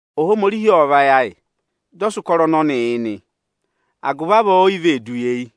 Ohomorihi ô sì ịrẹyị ayị, dị ọ sị ụkọrọ ọnọnịị yị nị, agụvị avọọ, o yi vee du yi eyi.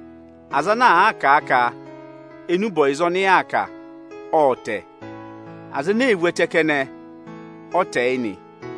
Aza ana àa ka enube ọyịza ọnị yaa kà ộ tẹ, aza ene ee vu ẹtẹ kẹnẹ ọ tẹ yị nị.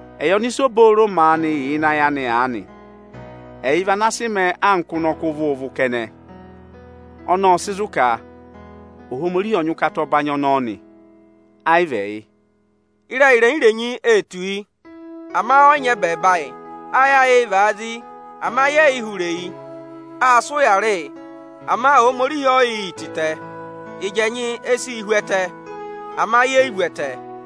Ẹyị ọnịsa obooro maanị yà ịnị ayị anị aanị, ẹyị vị ana sị mẹẹ anka ụnọkọ ụvụ-ụvụ kẹnẹ. Ọnọọ ọ sị zụ̀ ka Ohomorihi ọ nyị ụkata ọnọọ nị, ẹ yị vị ẹyị. Ịrẹyị irenyi-irenyi ee tù yị, ama ẹ yị nyị ẹbẹẹba ayị. Ayị ayịị̄ vaa zi, ama ye yi hụrẹ eyi. Aa sị ụyaa rị yị, ama Ohomorihi o yi yi yị tịtẹ. Ịjị ẹnyị e si yi hú ẹtẹ, ama ye yi vu ẹtẹ.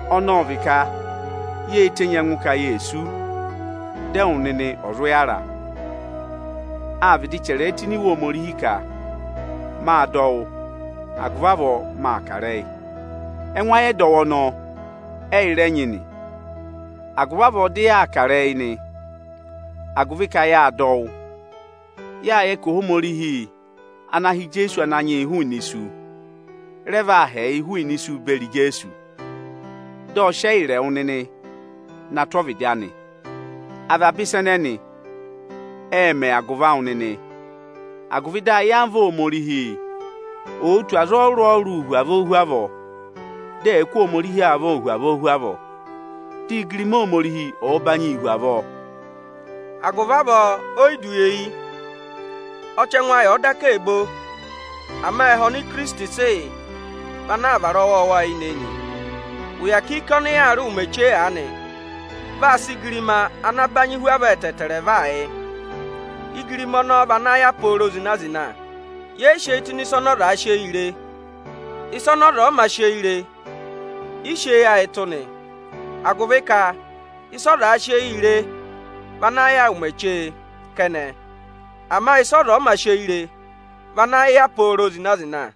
Ọnọọ ọ vị ka yê tenyi ẹngụ ka ye sú, dị ẹwụ nịnị ọ̀ zụ yàra. Â vịdị chẹrẹ ẹ tụ́ ini Iwe Ohomorihi ka, “Mâ dọ wụ́, agụvị avọọ mâ kà ịrẹyị”. Ẹngụ ayị ẹdọwụ ọnọọ ẹyị rẹ nyị nị, agụvị avọọ dị yaa kà ịrẹyị nị, agụvị ka yâ dọ wụ́. Yâ yẹ ka Ohomorihi ana ha Ananyị yị Ijeesu hụụnị isu, rẹ vaa ha ẹyịị hụụnị isu beri Ijeesu. Dị ọ sị ẹyịrị ẹwụ nịnị na tụ́ ọvịdị anị. Avaba ịsa ẹnẹnị ệ mẹ agụvị awụ nịnị, agụvị ayamva Ohomorihi ò tù aza ọrụrụ-ọrụrụ hu avọọ hu avọọ, dị ẹ̀ẹ kụ́ Ohomorihi avọọ hu avọọ hu avọọ, dị igirima Ohomorihi ọ̀ọ banyịị hu avọọ. Agụvị avọọ, o yi du eyi. Ọchẹngụ ayị ọ̀ọ daka ee bo, ama ẹhẹ ọnị Ikirisiti, sị yị vị ana aa vara ọwọọwa eyinị-eyinị. Ụya kiiki ọnị yaa rị ụmẹ chee aanị, vaa sị igirima vaa yị. Igirima ọnọọ vị ana vaa yà pooro zịna-zịna. Ye yi si eyi ayị tụ́ ịnị ịsa ọzaā sị eyii re. Ịsa ọza ọ̀ yị mā sị eyii re i si eyi tụ́ nị. Agụvị ka ịsa ọzaā sị eyii re vị ana yà yị ụmẹ chee kẹnẹ, ama ịsa ọza ọ̀ yị mā sị eyi re, vị ana yà pooro zịna-zịna.